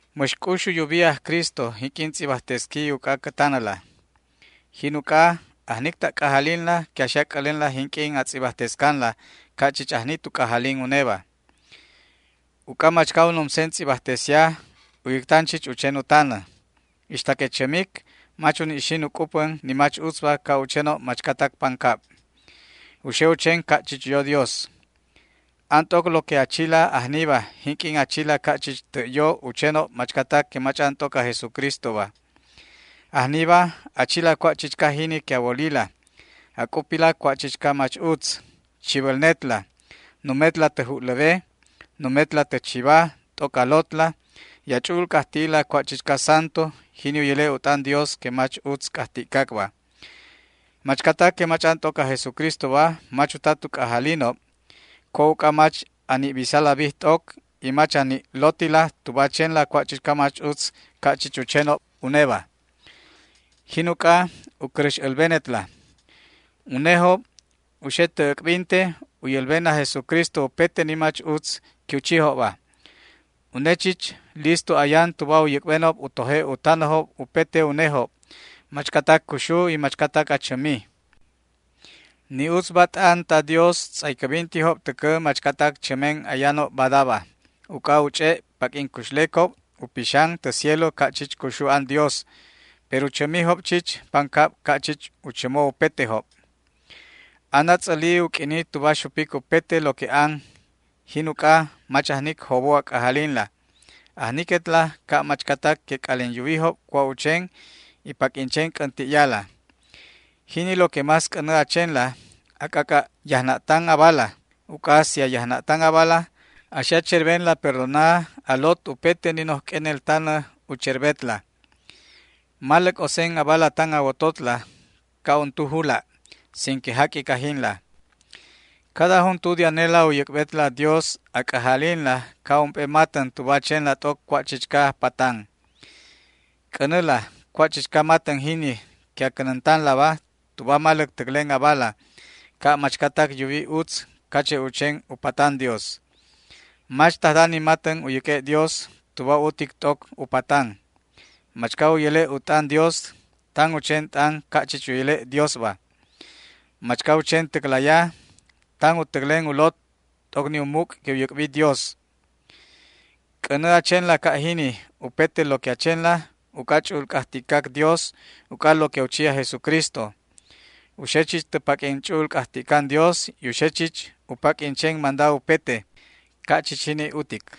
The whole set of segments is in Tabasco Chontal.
Mäx c'ux u yubi aj Cristo jinq'uin tz'ibajtesqui uc'a cä tanäla. Jin uc'a ajnic ta' c'ajalinla que a xe a c'älenla jinq'uin a tz'ibajtescanla, ca' chich ajni tu c'ajalin uneba. Uc'a machca u numsen tz'ibajtesia u yäctan chich u chen u tanä. Ixta que chämic mach uni' xin u c'upän ni mach utzba ca' u chenob machcatac pancab. U xe u chen ca' chich yo Dios. An t'oc lo que a chila ajniba jinq'uin a chila ca' chich tä' yo u chenob machcatac que mach'an t'oc aj Jesucristoba. Ajniba a chila cua' chichca jini que a wolila, a c'upila cua' chichca mach utz, chibälnetla, numetla tä ju'läwe, numetla tä chiba t'oc a lotla y a ch'u'ul c'ajti'ila cua' chichca santu, jini u yäle' u t'an Dios que mach utz c'ajti'cacba. Machcatac que mach'an t'oc aj Jesucristoba mach uta tu c'ajalinob cua' uc'a mach a ni' bisala bij t'oc y mach a ni' lotila tuba a chenla cua' chichca mach utz ca' chich u chenob uneba. Jin uc'a u cäräx älbenetla. Unejob u xe tä äc'binte u yälben aj Jesucristo upete ni mach utz que u chijob. Une chich listo ayan tuba u yäc'benob u toje' u tanäjob upete unejob, machcatac cuxu y machcatac achämi. Ni utzba t'an ta Dios tz'aycäbintijob täcä machcatac chämen ayanob badaba, uc'a u ch'e' paq'uin cuxlecob u pixan tä cielo ca' chich cuxu an Dios. Pero chämijob chich pancab ca' chich u chämo upetejob. Anätz'äli u q'uini tuba xupic upete lo que an. Jin uc'a, mach ajnic jobo a c'ajalinla. Ajniquetla ca' machcatac que c'alin yuwijob cua' u chen, y paq'uin chen c'änti'yala. Jini lo que más c'änä a chenla, a c'ac'a' yajna'tan abala, uc'a si a yajna'tan abala, a xe a cherbenla perdona a lot upete ni noj q'uenel tanä u cherbetla. Maläc osen abala tan a wototla ca' untu jula', sin que jaq'uic ajinla. Cada juntu de anela u yäc'betla Dios a c'ajalinla ca' ump'e matän tuba a chenla t'oc cua' chichca patan. C'änäla cua' chichca matän jini que a cänäntanlaba tuba a maläc täclen abala, ca' machcatac yuwi utz cache' u chen u patan Dios. Mach tajda ni matän u yäq'ue' Dios tuba utic t'oc u patan. Machca u yäle' u t'an Dios, tan u chen t'an ca' chich u yäle' Diosba. Machca u chen täclaya, tan u täclen u lot t'oc ni u muc' que u yäc'bi Dios. C'änä a chenla ca' jini upete lo que a chenla uc'a ch'u'ul c'ajti'cac Dios uc'a lo que u chi aj Jesucristo. U xe chich tä paq'uin ch'u'ul c'ajti'can Dios y u xe chich u paq'uin chen manda upete. Ca' chich jini utic.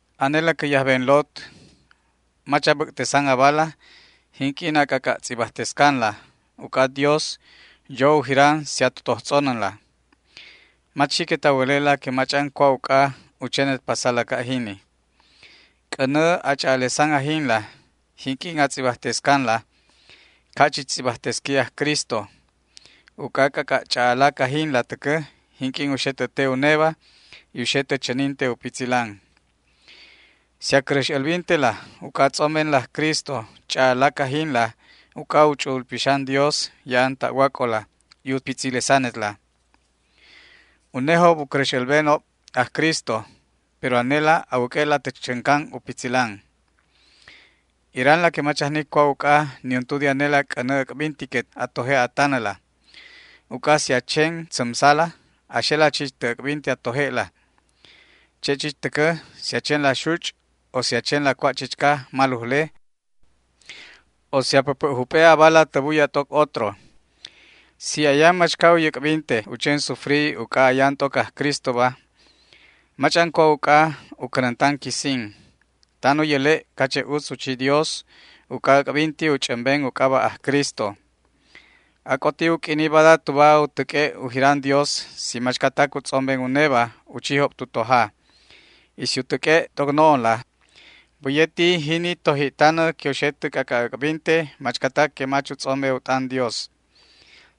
Anela cä yajben lot, mach a bäc'tesan abala jinq'uin a c'ac'a' tz'ibajtescanla, uc'a Dios yo u jiran si a totoj tz'onänla. Mach xiquet a wäle'la que mach'an cua' uc'a u chenet pasala ca' jini. C'änä a ch'a'alesan ajinla jinq'uin a tz'ibajtescanla ca' chich tz'ibajtesqui aj Cristo, uc'a c'ac'a' ch'a'alac ajinla täcä jinq'uin u xe tä te uneba y u xe tä chäninte u pitzilan. Si a cäräx älbintela uc'a a tz'ombenla aj Cristo ch'a'alac ajinla uc'a u Ch'u'ul Pixan Dios ya'an ta'wac'ola y u pitzilesanetla. Unejob u cäräx älbenob aj Cristo, pero anelaba a wäq'ue'la tä chäncan u pitzilan. Iranla que mach ajnic cua' uc'a niuntu de anela c'änä äc'bintiquet a toje' a tanäla. Uc'a si a chen tzämsala a xela chich tä äc'binte a toje'la. Che' chich täcä si a chenla xuch' o si a chenla cua' chichca malujle o si a päpä' jup'e' abala tä buya t'oc otro. Si ayan machca u yäc'binte u chen sufri uc'a ayan t'oc aj Cristoba mach'an cua' uc'a u cänäntan quisin. Tan u yäle' cache' utz u chi Dios uc'a äc'binti u ch'ämben u c'aba' aj Cristo. Ac'oti u q'uini bada tuba u täq'ue' u jiran Dios si machcatac u tz'omben uneba u chijob tu toja; y si u täq'ue' t'oc no'onla, bäye ti jini toji'tanä que u xe tä c'ac'a' äc'binte machcatac que mach u tz'ombe u t'an Dios.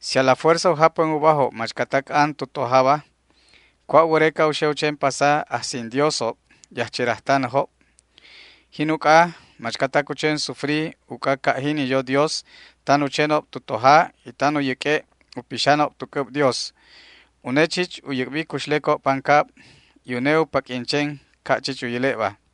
Si a la fuerza u japän ubajob machcatac an tu tojaba, ¿cua' wäreca u xe u chen pasa ajsin Diosob y ajcherajtanäjob? Jin uc'a, machcatac u chen sufri uc'a ca' jini yo Dios, tan u chenob tu toja y tan u yäq'ue' u pixanob tu c'äb Dios. Une chich u yäc'bi cuxlecob pancab y une u paq'uin chen ca' chich u yäle'ba.